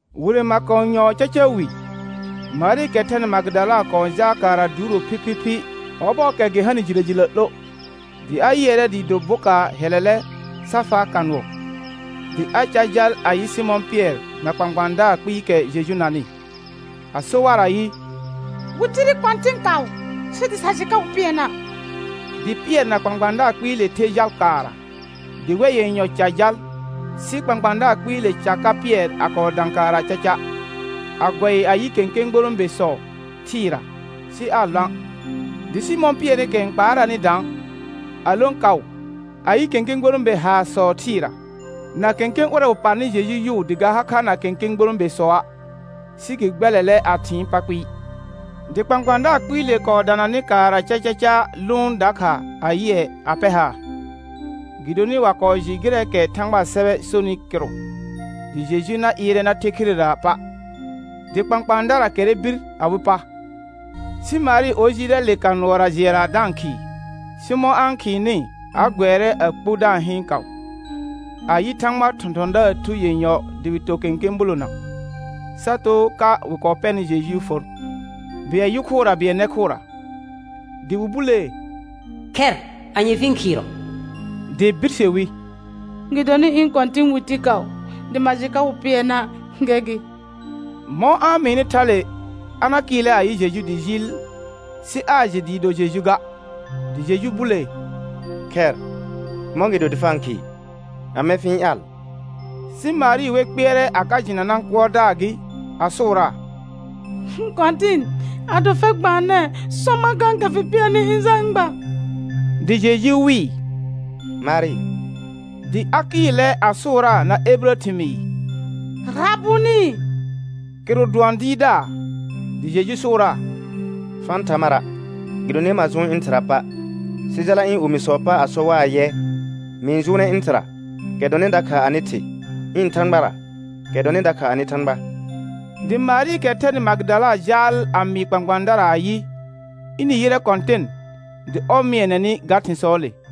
Wire makonyɔɔ caca wi, Marɩɩkɛ thɛnɩ Magɩdala kɔɔ jaal kaara duuro phiphiphi ɔbɔɔkɛ gɩ hanɩ jilə jilə 'lo. Dɩ a yɩɛrɛ dɩɩ do bokaar hɛlɛlɛ sa faa ka nʋɔ. Dɩ a car jal a yɩ Sɩmɔ̃ Pɩɛr na kpãkpãadaar kpɩɩkɛ Jeju nanɩ, a so war ayɩ: Wɩ tire Kɔ̃tɩn kaʋ sɩ dɩ sa jɩ ka wɩ pɩɛna'. Dɩ Pɩɛr na kpãkpãadaar kpɩɩle ther jal kaara. Dɩ wɛr yenyɔ car jal. Sɩ kpãkpãadaar kpɩɩle car ka Pɩɛr a kɔɔ dã kaara caca, a gʋɛ a yɩ kẽkẽ gborõbesɔ thɩɩra, sɩ aa lõa'. Dɩ Sɩmɔ̃ Pɩɛrɩkɛ n kpaaraanɩ daan, a lõ kaʋ a yɩ kẽkẽ gborõbe haarsɔ thɩɩra, na kẽkẽ ʋrɛ wɩ parnɩ Jeju yʋʋ dɩ ga ha kha na kẽkẽ gborõbesɔa', sɩ gɩ gbɛlɛlɛ a thɩɩn pa kpɩɩ. Dɩ kpãkpãadaar kpɩɩle kɔɔ dananɩ kaara cacaca lʋʋn dakha a yɩɛ a pɛr haar. Gɩdonɩ wa kɔɔ jɩ gɩrɛɛkɛ Thãgbaa sɛbɛ sonɩ kɩrʋ, dɩ Jeju na ɩɩrɛ na the khirera pa'. Dɩ kpãkpãadara kɛrrɛ bir awɩ pa. Sɩ Marɩ or jɩɩlɛ le ka nʋɔra jɩɛra da-n khɩɩ. Sɩ mɔ̃ a-n khɩɩnɩ, a gʋɛrɛ a kpu da-n hɩɩn kaʋ, a yɩ Thãgbaa thɔ̃thɔ̃daar thu yenyɔ dɩ wɩ to kẽkẽ bulona, sa too ka wɩ kɔɔ pɛnɩ Jejuu for, bɩɛl yʋ khʋra bɩɛl nɛ khʋra. Dɩ wɩ bulee: Khɛr, anye fɩ-n khɩɩrɔ? Dɩ birse wi: Gɩdonɩ ɩ̃ Kɔ̃tɩ̃ wɩ ti kaʋ dɩ ma jɩ ka wɩ pɩɛna', gɛr gɩ. Mɔ̃ a-n mɩɩnɩ thale, a na kɩɩlɛ a yɩ Jeju dɩ jɩɩl, sɩ aa jɩ dɩɩ do Jeju ga. Dɩ Jeju bulee: Khɛr, mɔ̃gɩdo dɩ fa-n khɩɩ? Amɛ fɩ-n ƴaal? Sɩ Marɩ wer kpɩɛrɛ a ka jɩna nãkʋɔrdaar gɩ, a sʋʋraa: Kɔ̃tɩn, ado fɛr gbaanɛɛ sɔ mar kãkɛ fɩ pɩɛnɩ ɩ̃ jal ɩ̃ gba. Dɩ Jeju wɩɩ: Marɩ. Dɩ a kɩɩlɛ a sʋʋraa na ebirə thɩmɩɩr: Rabʋnɩ. Kɩrʋ dʋɔn Dɩɩrdaar. Dɩ Jeju sʋʋraa: Fa-n tha mara', gɩdonɩ ma jʋʋn ɩ̃ Thɩra pa'. Sɩ jala ɩ̃ omisɔɔ pa a sɔ war ayɛ: Mɩ-n jʋʋnɛ ɩ̃ Thɩra, kɛ dɔnɩ dakha anɩ Thɩ, ɩ̃ Thãgbara kɛ dɔnɩ dakha anɩ Thãgba. Dɩ Marɩɩkɛ thɛnɩ Magɩdala jaal a mɩɩ kpãkpãadara ayɩ, ɩnɩ yɩrɛ Kɔ̃tɩn dɩ ɔr mɩɛnɛ nɩ ga thɩ̃sɔɔle.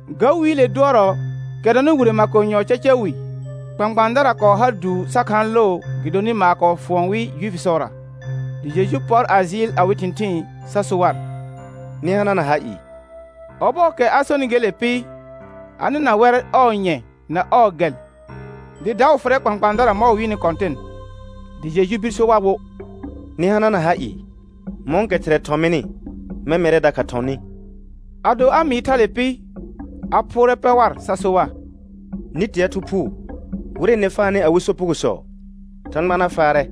Ga wiile dʋɔrɔ, kɛ dɔnɩ wire makonyɔɔ caca wi, kpãkpãadara kɔɔ har duu sa khaan loo gɩdonɩ maar kɔɔ fuɔn wɩ Juifisɔra; dɩ Jeju pɔr a jɩɩl awɩ thɩ̃thɩɩn sa so war: Nɩ hanana ha ɩɩ. Ɔbɔɔkɛ a sonɩ gele pɩ, a nɩna wɛr ɔɔ nyɛ na ɔɔ gɛl, dɩ daʋ fʋrɛ kpãkpãadara mɔ̃ wɩ yɩnɩ Kɔ̃tɩn. Dɩ Jeju bir so war wo: Nɩ hanana ha ɩɩ. Mɔ̃kɛ Thɩrɛ thɔ̃ mɩnɩ mɛ̃ mɛrɛ dakha thɔ̃ nɩ. Ado a mɩɩ thale pɩ, a phʋʋrɛ pɛ war sa so war: Nɩ tea Thu Phuu. Wɩrɛ nɩ faanɩ awɩ sopugosɔ, Thãgba na faarɛ,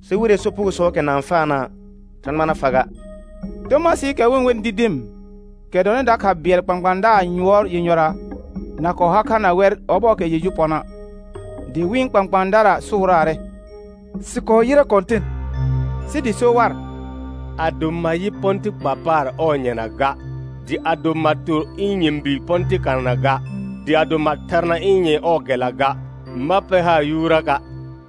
sɩ wɩrɛɛ sopugosɔɔkɛ na-n faana', Thãgba na fa ga. Tomasɩɩkɛ wɩ-n wenɩ Didim, kɛ dɔnɩ dakha bɩɛl kpãkpãadaar yʋɔr yenyɔra na kɔɔ ha kha na wɛr ɔbɔɔkɛ Jeju pɔna'. Dɩ wɩ̃ kpãkpãadara sʋʋraarɛ: Sɩ kɔɔ yɩrɛ Kɔ̃tɩn. Sɩ dɩ so war: Ado ma yɩ pɔ̃tɩ kpa paar ɔɔ nyɛna ga, dɩ ado ma tor ɩ̃ nyɛ̃bi pɔ̃tɩ kanana ga, dɩ ado ma tharna ɩ̃ nyɛ̃ ɔɔ gɛlla ga, ma pɛr haar yuuraka'.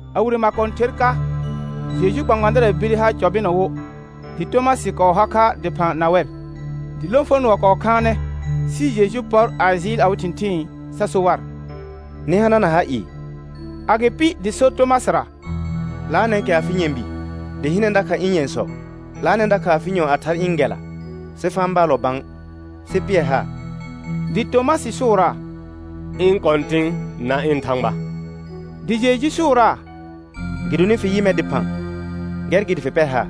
A wire makõther ka, Jejuu kpãkpãadara bire ha cɔ bɩnɔ wo, dɩ Tomasɩ kɔɔ har kha dɩphã na wɛr. Dɩ lõfonʋɔ kɔɔ khaanɛ, sɩ Jeju pɔr a jɩɩl awɩ thɩ̃thɩɩn sa so war: Nɩ hanana ha ɩɩ. Agɩpɩ dɩ so Tomasɩra: 'Laanɛ kɛ afɩ nyɛ̃bi, dɩ hɩnɛ dakha ɩ̃ nyɛ̃sɔ. 'Laanɛ dakha afɩ nyɔ̃ a thaar ɩ̃ gɛlla, sɩ fa-n baalɔ bã sɩ pɩɛr haar. Dɩ Tomasɩ sʋʋraa: Ɩ̃ Kɔ̃tɩ̃, na ɩ̃ Thãgba. Dɩ Jeju sʋʋraa: Gɩdonɩ fɩ yɩ mɛr dɩphã, gɛr gɩ dɩ fɩ pɛr haar.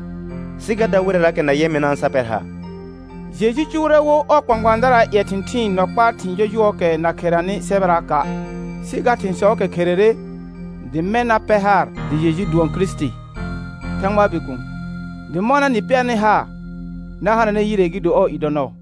Sɩ ga dar wɩrɛraakɛ na yɛ mɩna' sa pɛr haar. Jeju cʋʋrɛ wo ɔɔ kpãkpãadaraa ƴɛ thɩ̃thɩɩn nɔ kpaa thɩ̃ jɔjʋɔɔkɛ na kheranɩ sɛbɛraaka'. Sɩ ga thɩ̃sɔɔkɛ kherere, dɩ mɛ̃ na pɛr haar dɩ Jeju dʋɔn Kirisiti, Thãgbaa Bikuun, dɩ mɔna nɩ pɛrnɩ haar, na hananɛ yire gɩ do ɔɔ i dɔ nɔɔ.